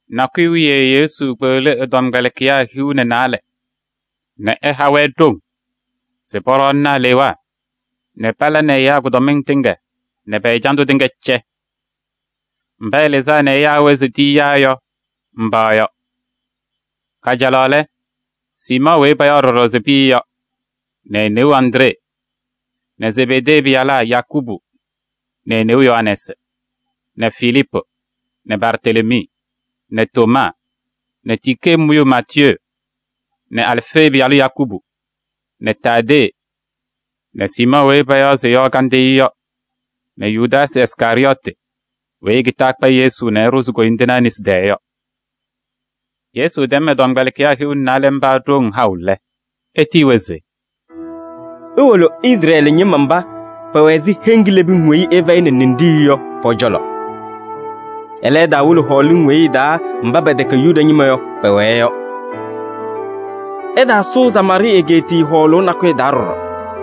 Nakʋyʋ wiye Yesu kpeɣli ɛ-tɔmkpɛlɩkɩyaa hiu nɛ naalɛ nɛ ɛha-wɛ ɖoŋ se pɔɖɔɔnɩnɩ alewaa nɛ pala nɛ ɛyaa kʋdɔmɩŋ tɩŋa nɛ pɛ-ɛjandʋ tɩŋa pɛcɛ. Mba ɛlɩzaa nɛ ɛyaa-wɛ se e-tiyiyaa yɔ, mba yɔ: kajalaɣ lɛ, Siimɔɔ weyi payaɣ ɖɔɖɔ se Pɩyɛ yɔ nɛ e-neu Andree nɛ Zebedee pɩyalaa Yakubu nɛ e-neu Yohanɛɛsɩ nɛ Filiipu nɛ Bartelemii nɛ Tomaa nɛ tikee mʋyʋ Maatiyee nɛ Alfee pɩyalʋ Yakubu nɛ Taadee nɛ Siimɔɔ weyi payaɣ se Yɔɔ Kandɩyʋ yɔ nɛ Yudaasɩ Iskarɩyɔɔtɩ weyi ekitaa ɛkpa Yesu nɛ ɛɖʋzɩ koyindinaa nesi taa yɔ. Yesu tɛm ɛ-tɔmkpɛlɩkɩyaa hiu nɛ naalɛ mba ɖoŋ haʋ lɛ, etiyi-wɛ se: “Iwolo Izrɛɛlɩ ñɩma mba pɛwɛ ɛzɩ heŋ kilebiŋ weyi ɩfɛyɩnɩ ninɖiɣyu yɔ pɔ-cɔlɔ. Ɛlɛ, ɩtaawolo hɔɔlɩŋ weyi ɩ-taa mba pɛtɛkɛ Yuda ñɩma yɔ, pɛwɛɛ yɔ. Ɩtaasʋʋ Samaarɩɩ egeetiye hɔɔlʋʋ nakʋyʋ taa ɖɔɖɔ.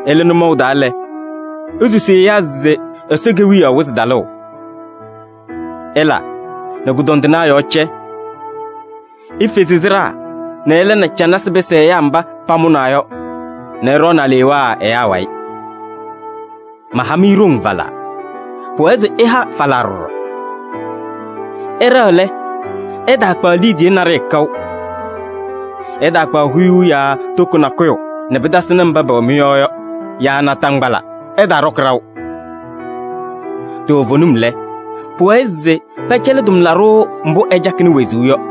Ɩlɩ nʋmɔʋ taa lɛ, isusi ɛyaa se Ɛsɔ Kewiyaɣ wɩzɩ talʋʋ. Ɩla nɛ kʋdɔndɩnaa yɔɔ cɛ. Ifezi sɩɖaa nɛ ɩla nɛ canasɩ pɩsɩ ɛyaa mba pamʋnaa yɔ nɛ ɩɖɔɔnɩ alewaa ɛyaa wayɩ. Maha-mɩ ɖoŋ falaa, pʋwɛɛ se ɩha falaa ɖɔɖɔ. Ɩɖɛɣ lɛ, ɩtaakpaɣ liidiye naɖɩyɛ kaʋ. Ɩtaakpaɣ huyuu yaa toko nakʋyʋ nɛ pɩtasɩnɩ mba pɛwɛ mɩ-yɔɔ yɔ yaa naataŋgbala, ɩtaaɖɔkɩ ɖaʋ. Toovenim lɛ, pʋwɛɛ se pɛcɛlɩ tʋmlaɖʋ mbʋ ɛcakɩnɩ wezuu yɔ.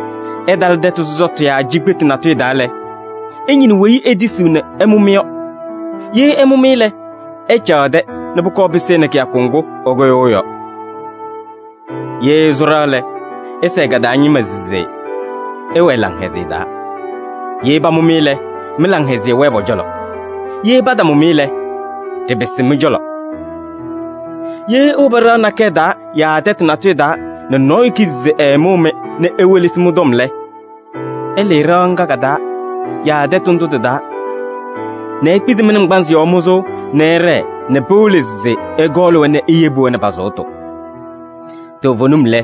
Ɩtalɩ tɛtʋ sɔsɔtʋ yaa cikpetu natʋyʋ taa lɛ, ɩñɩnɩ weyi etisiɣ nɛ ɛmʋ-mɩ yɔ. Ye ɛmʋ-mɩ lɛ, ɩcaɣ ɛ-tɛ nɛ pʋkɔɔ pɩsɩnɩ kɩyakʋ ŋgʋ ɩkʋyʋʋ yɔ. Ye ɩsʋ ɖɩɣa lɛ, ɩsɛɛ ka-taa ñɩma se: ‘Ɩwɛɛ laŋhɛzɩyɛ taa!’ Ye pamʋ-mɩ lɛ, mɩ-laŋhɛzɩyɛ wɛɛ pɔ-cɔlɔ. Ye patamʋ-mɩ lɛ, ɖɩpɩsɩ mɩ-cɔlɔ. Ye iwobi ɖɩɣa nakɛyɛ taa yaa tɛtʋ natʋyʋ taa nɛ nɔɔyʋ kizi se ɛɛmʋʋ-mɩ nɛ ewelesi mɩ-tɔm lɛ, ɩlɩɩ ɖɩɣa ŋga ka-taa yaa tɛtʋ ndʋ tɩ-taa nɛ ikpizi mɩ-naŋgbanzɩ yɔɔ mʋzʋʋ nɛ ɩɖɛɛ nɛ pɩwɩlɩ se ɩkɔɔlɩ-wɛ nɛ iyebi-wɛ nɛ pa-sʋʋtʋ. Toovenim lɛ,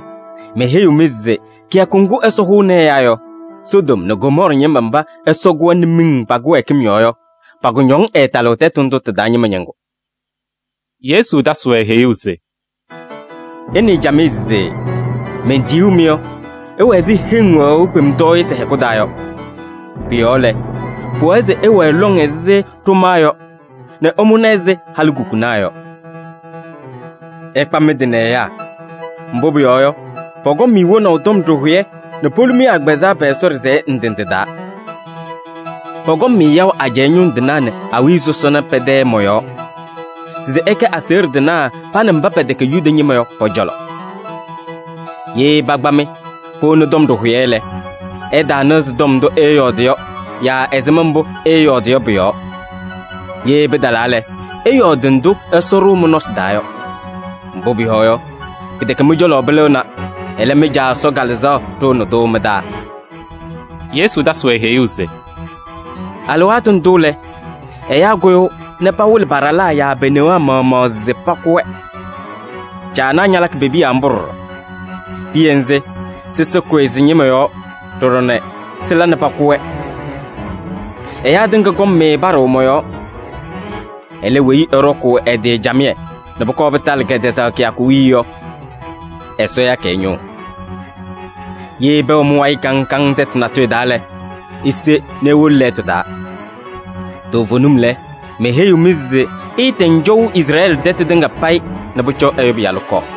meheyiɣ-mɩ se kɩyakʋ ŋgʋ Ɛsɔ hʋʋnɩ ɛyaa yɔ, Sodom nɛ Gomɔɔrɩ ñɩma mba Ɛsɔ kʋ-wɛ nɛ miŋ pa-kɩwɛɛkɩm yɔɔ yɔ, pa-kʋñɔŋ ɛɛtalɩɣ tɛtʋ ndʋ tɩ-taa ñɩma ñɩŋgʋ.” Yesu tasɩ-wɛ heyuu se: “Ɩnɩɩ camɩyɛ se mentiyuu-mɩ yɔ, ɩwɛ ɛzɩ heŋ wɛɣʋ kpemtɔɔyɩsɩ hɛkʋ taa yɔ. Pʋ-yɔɔ lɛ, pʋwɛɛ se ɩwɛɛ lɔŋ ɛzɩ ɖʋmaa yɔ nɛ ɩmʋna ɛzɩ halikukunaa yɔ. Ɩkpa mɩ-tɩ nɛ ɛyaa, mbʋ pʋyɔɔ yɔ, pɔkɔŋ-mɩ wonaʋ tɔm ɖɩhʋyɛ nɛ polu-mɩ agbazɛɛ pɛ-Ɛsɔ ɖɩsɛyɛ ndɩ ndɩ taa. Pɔkɔŋ-mɩ yaʋ ajɛɛ ñʋŋ tɩnaa nɛ awiya sɔsɔna pɛ-tɛ mɔ-yɔɔ se ɩkɛ aseɣɖe tɩnaa pa nɛ mba pɛtɛkɛ Yuda ñɩma yɔ pɔ-cɔlɔ. Ye pakpa-mɩ powoni tɔm ɖɩhʋyɛ lɛ, ɩtaanɩɣzɩ tɔm ndʋ ɩɩyɔɔdɩ yɔ yaa ɛzɩma mbʋ ɩɩyɔɔdɩ yɔ pʋ-yɔɔ. Ye pɩtalaa lɛ, ɩyɔɔdɩ ndʋ Ɛsɔ ɖʋʋ mɩ-nɔsɩ taa yɔ. Mbʋ pʋyɔɔ yɔ, pɩtɛkɛ mɩ-cɔlɔ pɩlɩɣna, ɛlɛ, mɩ-Caa Ɛsɔ Kalɩzaɣ ɖʋʋnɩ-tʋ mɩ-taa.” Yesu tasɩ-wɛ heyuu se: “Alɩwaatʋ ndʋ lɛ, ɛyaa kʋyʋʋ nɛ pawɩlɩ pa-ɖalaa yaa pe-newaa maɣmaɣ se pakʋ-wɛ. Caanaa ñalakɩ pe-piya mbʋ ɖɔɖɔ. Piya nzɩ, sɩsɩ kʋyɩ sɩ-ñɩma yɔɔ ɖɔɖɔ nɛ sɩla nɛ pakʋ-wɛ. “Ɛyaa tɩŋa kɔŋ-mɩ paɖʋʋ mɔ-yɔɔ. Ɛlɛ, weyi ɛɖɔkʋʋ ɛ-tɩ camɩyɛ nɛ pʋkɔɔ pɩtalɩ kɛtɛzaɣ kɩyakʋ wiye yɔ, Ɛsɔ yakɩ ɛ-ñʋʋ. Ye pɛwɛ mɩ-wayɩ kaŋ kaŋ tɛtʋ natʋyʋ taa lɛ, ise nɛ iwolo lɛɛtʋ taa. Toovenim lɛ, meheyiɣ-mɩ se ɩɩtɛŋ cɔʋ Izrɛɛlɩ tɛtʋ tɩŋa payɩ nɛ pʋcɔ Ɛyʋ Pɩyalʋ kɔɔ.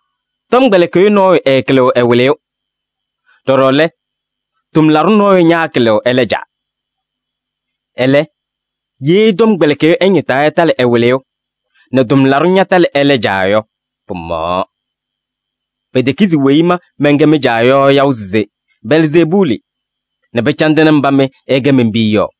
“Tʋmɩyɛ tɔmkpɛlɩkɩyʋ nɔɔyʋ ɛɛkɩlɩɣ ɛ-wɩlɩyʋ, ɖɔɖɔ lɛ tʋmlaɖʋ nɔɔyʋ ñaakɩlɩɣ ɛlɛ caa. Ɛlɛ, ye tɔmkpɛlɩkɩyʋ ɛñɩtaa ɛtalɩ ɛ-wɩlɩyʋ nɛ tʋmlaɖʋ ñatalɩ ɛlɛ caa yɔ, pɩmaɣaɣ. Petekizi weyi ma mɛnkɛ mɩ-caa yɔ yaʋ se Belzeebuuli nɛ pɩcandɩnɩ mba mɩ ɩkɛ men-piya yɔ?”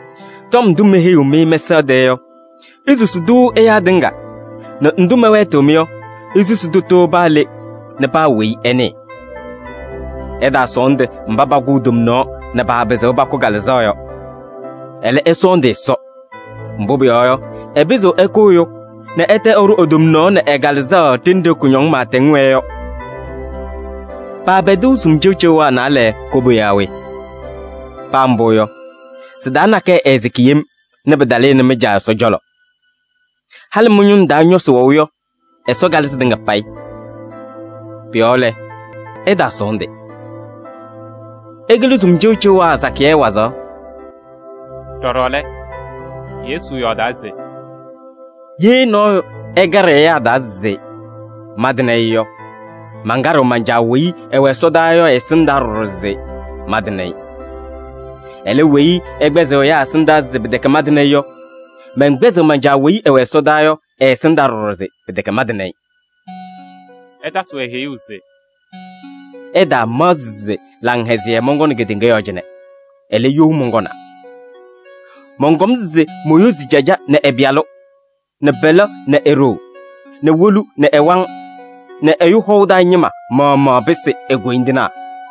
Tɔm ndʋ meheyiɣ-mɩ mɛsaɣ tɛɛ yɔ, isusi-tʋ ɛyaa tɩŋa nɛ ndʋ mɛwɛɛtɩɣ-mɩ yɔ, isusi tʋtʋ paa le nɛ paa weyi ɛnɩɩ. Ɩtaasɔɔndɩ mba pakʋʋ tomnaɣ nɛ paapɩzɩɣ pakʋ kalɩzaɣ yɔ. Ɛlɛ, ɩsɔɔndɩ Ɛsɔ, mbʋ pʋyɔɔ yɔ, ɛpɩzɩɣ ɛkʋ ɛyʋ nɛ ɛtɛ ɛɖʋ e-tomnaɣ nɛ ɛ-kalɩzaɣ ɖenɖe kʋñɔŋ pɩɩtɛŋ wɛɛ yɔ. Paapɛdɩɣ sumasɩ cɩʋcɩʋwaa naalɛ koba yaa we? Paa mbʋ yɔ, sɩ-taa nakɛyɛ ɛɛsɩkɩ yem nɛ pɩtalɩnɩ mɩ-Caa Ɛsɔ cɔlɔ. Halɩ mɩ-ñʋŋ taa ñɔsɩ wɛʋ yɔ, Ɛsɔ kalɩ sɩtɩŋa payɩ. Pʋ-yɔɔ lɛ, ɩtaasɔɔndɩ. Ɩkɩlɩ sumasɩ cɩʋcɩʋwaa sakɩyɛ wazaɣ.” Ɖɔɖɔ lɛ, Yesu yɔɔdaa se: “Ye nɔɔyʋ ɛkaɖɩ ɛyaa taa se mantɩnɩ-ɩ yɔ, mankaɖɩɣ man-Caa weyi ɛwɛ ɛsɔdaa yɔ ɛ-ɛsɩndaa ɖɔɖɔ se mantɩnɩ-ɩ. Ɛlɛ, weyi ɛkpɛzɩɣ ɛyaa ɛsɩndaa se pɩtɛkɛ mantɩnɩ-ɩ yɔ, mɛnkpɛzɩɣ man-Caa weyi ɛwɛ ɛsɔdaa yɔ ɛ-ɛsɩndaa ɖɔɖɔ se pɩtɛkɛ mantɩnɩ-ɩ.” Ɛtasɩ-wɛ heyuu se: “Ɩtaamaɣzɩ se laŋhɛzɩyɛ mɔnkɔnɩ kedeŋa yɔɔ cɩnɛ. Ɛlɛ, you mɔnkɔnaa. Mɔnkɔm se moyozi caja nɛ ɛ-pɩyalʋ, nɛ pɛlɛ nɛ e-ɖoo, nɛ wolu nɛ ɛ-waŋ, nɛ ɛyʋ hɔʋ taa ñɩma maɣmaɣ pɩsɩ e-koyindinaa.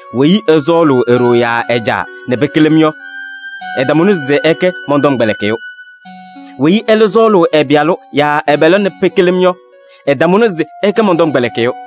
“Weyi ɛsɔɔlʋʋ e-ɖoo yaa ɛ-caa nɛ pɩkɩlɩ-m yɔ, ɛtamʋnɩ se ɛkɛ mɔn-tɔmkpɛlɩkɩyʋ. Weyi ɛlɛ sɔɔlʋʋ ɛ-pɩyalʋ yaa ɛ-pɛlɛ nɛ pɩkɩlɩ-m yɔ, ɛtamʋnɩ se ɛkɛ mɔn-tɔmkpɛlɩkɩyʋ.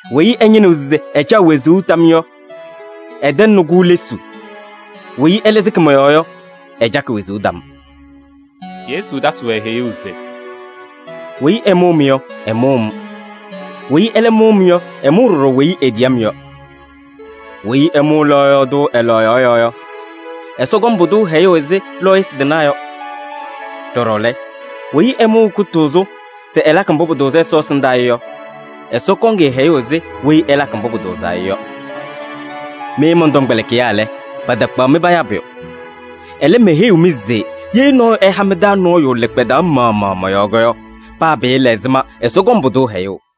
Weyi ɛñɩnɩɣ se ɛcaɣ wezuu tam yɔ, ɛtɛŋnɩ-kʋ lesuu. Weyi ɛlɛ sɩkɩ mɔ-yɔɔ yɔ, ɛcakɩ wezuu tam.” Yesu tasɩ-wɛ heyuu se: “Weyi ɛmʋʋ-mɩ yɔ, ɛmʋʋ-m. Weyi ɛlɛ mʋʋ-m yɔ, ɛmʋʋ ɖɔɖɔ weyi etiyi-m yɔ. Weyi ɛmʋʋ lɔɔyaɣ tʋ ɛ-lɔɔyaɣ yɔɔ yɔ, Ɛsɔ kɔŋ pʋdʋ hɛyʋʋ ɛzɩ lɔɔyɩsɩ tɩnaa yɔ. Ɖɔɖɔ lɛ, weyi ɛmʋʋ kʋtʋʋzʋ se ɛlakɩ mbʋ pʋtʋʋzɩ Ɛsɔ ɛsɩndaa yɔ, Ɛsɔ kɔŋ-ɩ hɛyʋʋ ɛzɩ weyi ɛlakɩ mbʋ pʋtʋʋzaa yɔ. Mɩ mɔn-tɔmkpɛlɩkɩyaa lɛ, patakpaɣ-mɩ payaa pʋyʋ. Ɛlɛ, meheyiɣ-mɩ se ye nɔɔyʋ ɛha mɩ-taa nɔɔyʋ lɩkpadaɣ maɣmaɣ mɔ-yɔɔ yɔ, paa pɩɩla ɛzɩma, Ɛsɔ kɔŋ pʋdʋ hɛyʋʋ.”